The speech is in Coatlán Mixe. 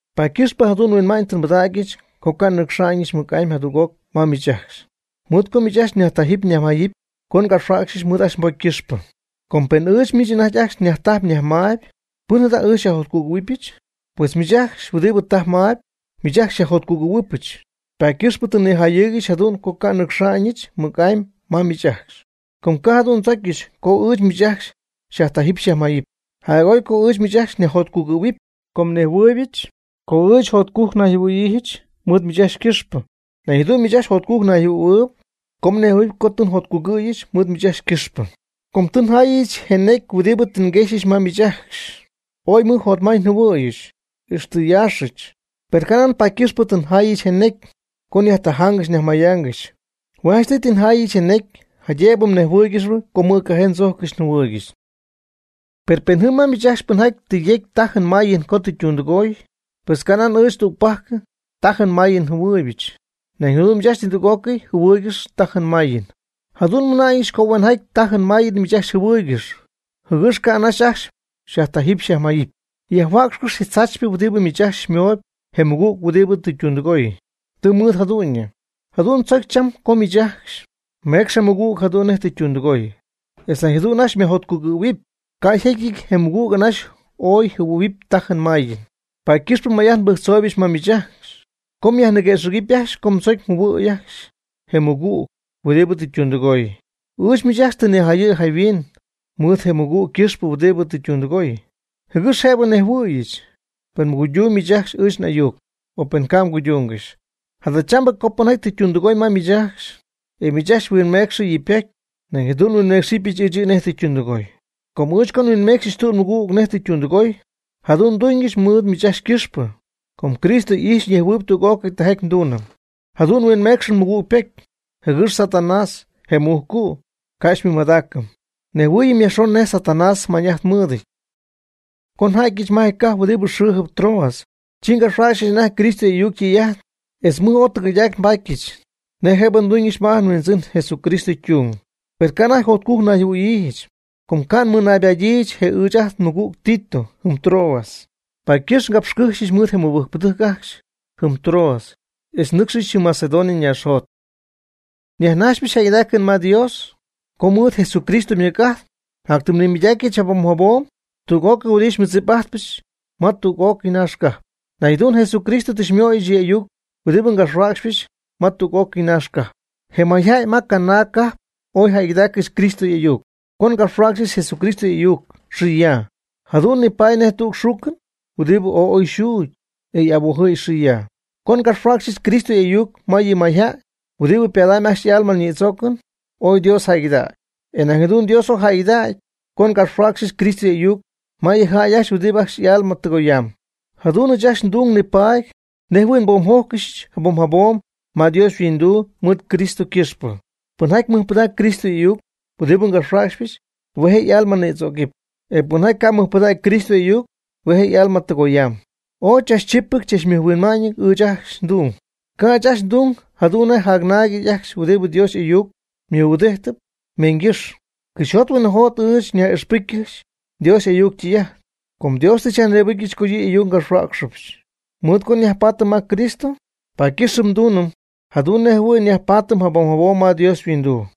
Paady ycɨxpɨ jadu'n nhuinma'ñ tɨ nbɨdägyɨch co ca' nnɨcxa'ñɨch mɨc'amy jadüg'oc ma miich ajcxy, mɨɨd co miich ajcxy nyajtajɨ́py nyajmayɨ́py co ngapxhuijyɨch mɨɨd ajcxy mbocy ycɨxpɨ. Com pen ɨɨch miich anajty ajcxy nyajtajpy nyajmaayb, ¿pɨn jada' ɨɨch xyajjotcugɨ̈huɨbɨch? Pues miich ajcxy huɨdibɨ tajp mayb, miich ajcxy xyajjotcugɨ̈huɨbɨch. Paady ycɨxpɨ tɨ nnijayɨɨygɨxy jadu'n co ca' nnɨcxa'ñɨch mɨc'amy ma miich ajcxy, com ca' jadu'n ndzocyɨch co ɨɨch miich ajcxy nyajtajɨpy nyajmayɨpy. Jac'oy co ɨɨch miich ajcxy nyajjotcugɨ̈huɨpy. Com nejhuɨɨybɨch co ɨɨch jotcujc nayjɨhuɨ̈yiijɨch mɨɨd miich ajcxy ycɨxpɨ. Nañ jadu'n miich ajcxy jotcujc mnayjɨhuɨ̈huɨɨyb co mnejhuɨ̈huɨpy co tɨ njotcugɨ̈huɨbɨch mɨɨd miich ajcxy ycɨxpɨ. Co tɨ njayɨch je necy huɨdibɨ tɨ nguexyɨch ma miich ajcxy, ooy mɨj jotmay tɨ njɨhuɨ̈yɨch, ixtɨ nyaaxɨch. Per ca' nan paady ycɨxpɨ tɨ njaayɨch je necy co nyajtajaangɨxy nyajmayaangɨxy. Hue' janchtɨy tɨ njaayɨch je necy jaydëbɨ mnejhuɨɨygɨxy co mɨjcajee ndzojccɨxy njɨhuɨɨygɨxy. Per pen jɨm ma miich ajcxy pɨnjaty tɨ yecy tajɨn mayɨm co tɨ ytundɨgooy, pues ca' nan ɨɨch tügpajc tajɨn mayɨm jɨhuɨɨybɨch. Nañ jadu'n miich ajcxy nidüg'ócɨy mjɨhuɨɨygɨxyp tajɨn mayɨn. Jadu'n nmɨna'ñɨch co huenjaty tajɨn mayɨn miich ajcxy mjɨhuɨɨygɨxy, jɨgɨx ca' anaxy ajcxy nyajtajɨ́p nyajmayɨ́p. Yajhuäcxɨjp je tzaachypɨ huɨdibɨ miich ajcxy mooyb je mɨgüg huɨdibɨ tɨ ytundɨgooy. Tɨ mɨɨd jadu'ñɨ. Jadu'n tzocy cham co miich ajcxy meecx je mɨgüg jadu'n nej tɨ ytundɨgooy, etz nañ jadu'n ajcxy myajjotcugɨ̈huɨpy. Ca' yjecyɨty co je mɨgüg anaxy oy jɨhuɨ̈huɨp tajɨn mayɨn. Paady ycɨxp may'ajt nbɨjctzooyɨch ma miich ajcxy co myajniguëxɨ̈gɨpy ajcxy co mdzocy mjɨhuɨ̈y ajcxy je mɨgüg huɨdibɨ tɨ ytundɨgooy. Ɨɨch miich ajcxy tɨ nijayɨ̈y jayhuin mɨɨd je mɨgüg ycɨxpɨ huɨdibɨ tɨ ytundɨgooy, jɨgɨx jëbɨ nnejhuɨɨyɨch, pen mguydumyb miich ajcxy ɨɨch n'ayuc, o pen ca' mguydungɨxy. Jadachambɨ co pɨnjaty tɨ ytundɨgooy ma miich ajcxy, e miich ajcxy mhuinmecxɨ yɨ' ypocy, nañ jadu'n nhuinmeecxɨp ɨɨch yɨ' nej ytundɨgooy. Com ɨɨch co nhuinmeecxyɨch tüg nmɨgügɨch nej tɨ ytundɨgooy, jadu'n nduñɨch mɨɨd miich ajcxy ycɨxpɨ, com Cristo y'ijxyp ñejhuɨɨyb tüg'ócɨy tijaty nduunɨm. Jadu'n nhuinmeecxɨm nmɨgüg ypocy, jɨgɨx Satanás, je mujcu', ca' xymɨmadaacɨm. Nejhuɨɨyɨm yajxon nej Satanás mañ'ajt mɨɨdɨty. Co nja'tyɨch ma je cajp huɨdibɨ xɨɨjɨp Troas, chi ngapxhuäcxa'ñɨch anajty Cristo y'ayuc ytɨy'ajt, etz mɨj ooy tɨgɨydac nbatyɨch, nej jëbɨ nduñɨch ma ajt nHuindzɨn Jesucristo ytung. Per ca' anajty jotcujc nayjɨhuɨ̈yiijɨch. Com ca' nmɨnaybatɨch je ɨɨch ajt nmɨgüg Tito jɨm Troas. Paady ycɨxp ngapxycɨjxyɨch mɨɨd je mɨbɨjcpɨdɨjc ajcxy jɨm Troas, e nnɨcxyɨch jɨm Macedonia ñaaxjot. Nyajnajxypɨch jäygɨdaacɨn ma Dios co mɨɨd Jesucristo ymɨc'ajt jatytimy nmɨmadacypɨch jabom jabom tüg'ócɨy huɨdibɨ xymɨdzip'ajtpɨch ma tüg'ócɨy naax cajp. Nañ jadu'n Jesucristo tɨ xymöyɨch yɨ' y'ayuc huɨdibɨ ngapxhuäcxypɨch ma tüg'ócɨy naax cajp. Je mayjäy ma canaag cajp ooy jäygɨdaaccɨxy Cristo y'ayuc. Co ngapxhuäcxɨch Jesucristo y'ayuc xɨ ya, jadu'n nipaady nej tüg xuucɨn huɨdibɨ ooy oy xuugy, e y'abojɨ̈y xɨ ya. Co ngapxhuäcxyɨch Cristo y'ayuc ma yɨ mayjäy huɨdibɨ padamb ajcxy y'alma ñïdzoocɨn ooy Dios jäygɨdägy. E ñañ jadu'n Dios ooy jäygɨdägy co ngapxhuäcxyɨch Cristo y'ayuc ma yɨ jäy ajcxy huɨdibɨ ajcxy y'alma tɨgoyaamb. Jadu'n ɨɨch ajcxy ndung nipaady nej jɨhuɨ̈y nboomjójcɨxɨch jabom jabom ma Dios yhuinduu mɨɨd Cristo ycɨxpɨ. Pɨnjaty mɨjpɨdacp Cristo y'ayuc huɨdibɨ ngapxhuäcxypɨch, hue' je' y'alma nïdzögamb. E pɨnjaty ca' mɨjpɨdägy Cristo y'ayuc, hue' je' y'alma tɨgoyaamb. Ooy chachchipɨty chachmɨjhuinma'ñɨty ɨɨch ajcxy ndung. Ca' ɨɨch ajcxy nduñ jadu'n nej jacnaagɨty ajcxy huɨdibɨ Dios y'ayuc mɨhuɨdijtɨp meeñgɨ́xy. Cɨxyjot huinɨjot ɨɨch jäy nyaj'ixpɨjccɨxy Dios y'ayuc ytɨy'ajt. Com Dios tɨ xyajnïbɨcyɨch co yɨ' y'ayuc ngapxhuäcxɨch. Mɨɨd co nyajpaatɨm ma Cristo, paady ycɨxp nduunɨm jadu'n nej jɨhuɨ̈y nyajpaatɨm jabom jabom ma Dios yhuinduu.